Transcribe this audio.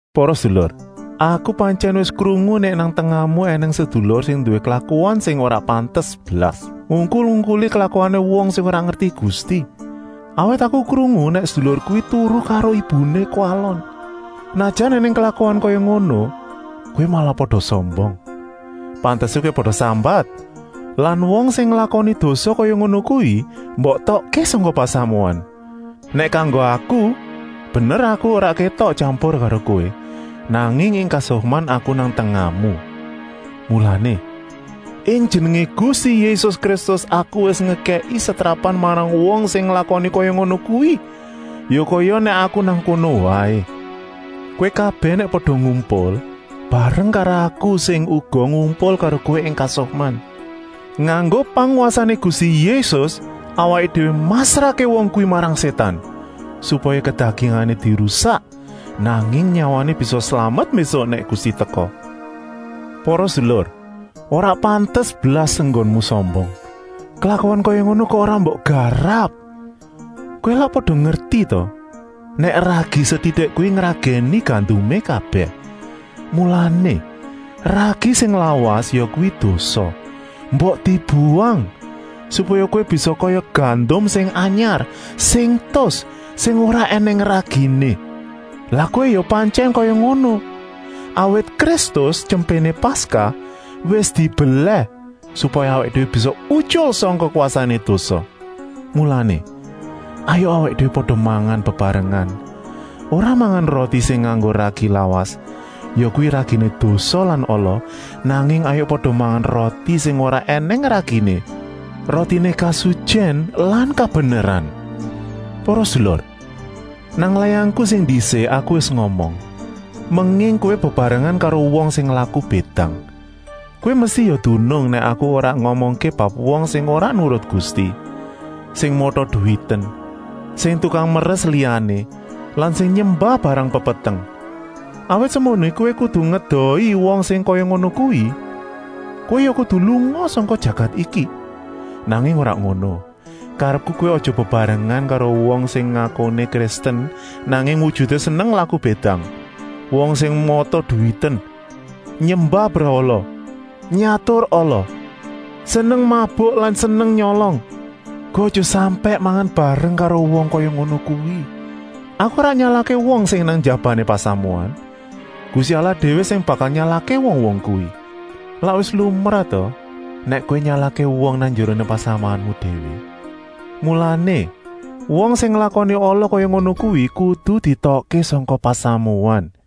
Para sedulur, aku pantyèn wis krungu nèk nang tengahmu ènèng sedulur sing nduwé klakuan sing ora pantes blas, ngungkul-ungkuli klakuané wong sing ora ngerti Gusti. Awit aku krungu nèk sedulur kuwi turu karo ibuné kuwalon. Senajan ènèng klakuan kaya ngono, kowé malah pada sombong. Pantesé kowé pada sambat lan wong sing nglakoni dosa kaya ngono kuwi mbok etokké sangka pasamuan. Nèk kanggo aku, bener aku ora kétok tyampur karo kowé, nanging ing kasukman aku nang tengahmu. Mulané, ing jenengé Gusti Yésus Kristus aku wis ngekèki setrapan marang wong sing nglakoni kaya ngono kuwi, ya kaya nèk aku nang kono waé. Kowé kabèh nèk pada ngumpul, bareng karo aku sing uga ngumpul karo kowé ing kasukman, nganggo pangwasané Gusti Yésus, awaké déwé masrahké wong kuwi marang Sétan, supaya kedagingané dirusak, nanging nyawané bisa slamet mbésuk nèk Gusti teka. Para sedulur, ora pantes blas enggonmu sombong. Klakuan kaya ngono kok ora mbok garap? Kowé lak pada ngerti ta nèk ragi setitik kuwi ngragèni gandumé kabèh? Mulané, ragi sing lawas, yakuwi dosa, mbok dibuwang, supaya kowé bisa kaya gandum sing anyar, sing tus, sing ora ènèng raginé. Lan kowé ya pantyèn kaya ngono. Awit Kristus, Tyempéné Paskah, wis dibelèh, supaya awaké déwé bisa utyul sangka kwasané dosa. Mulané, hayuk awaké déwé pada mangan bebarengan, ora mangan roti sing nganggo ragi lawas, yakuwi raginé dosa lan ala, nanging hayuk pada mangan roti sing ora ènèng raginé, rotiné kasutyèn lan kabeneran. Para sedulur, nang layangku sing ndisik aku wis ngomong, menging kowé bebarengan karo wong sing laku bédang. Kowé mesti ya dunung nèk aku ora ngomongké bab wong sing ora nurut Gusti, sing mata-duwiten, sing tukang meres liyané lan sing nyembah barang pepeteng. Awit semunggoné kowé kudu ngedohi wong sing kaya ngono kuwi, kowé ya kudu lunga sangka jagat iki. Nanging ora ngono, karepku kowé aja bebarengan karo wong sing ngakuné Kristen, nanging wujuté seneng laku bédang, wong sing mata-duwiten, nyembah brahala, nyatur ala, seneng mabuk lan seneng nyolong. Kowé aja sampèk mangan bareng karo wong kaya ngono kuwi. Aku ora nyalahké wong sing nang njabané pasamuan. Gusti Allah déwé sing bakal nyalahké wong-wong kuwi. Lak wis lumrah ta nèk kowé nyalahké wong nang njeroné pasamuanmu déwé. Mulané, wong sing nglakoni ala kaya ngono kuwi kudu dietokké sangka pasamuan.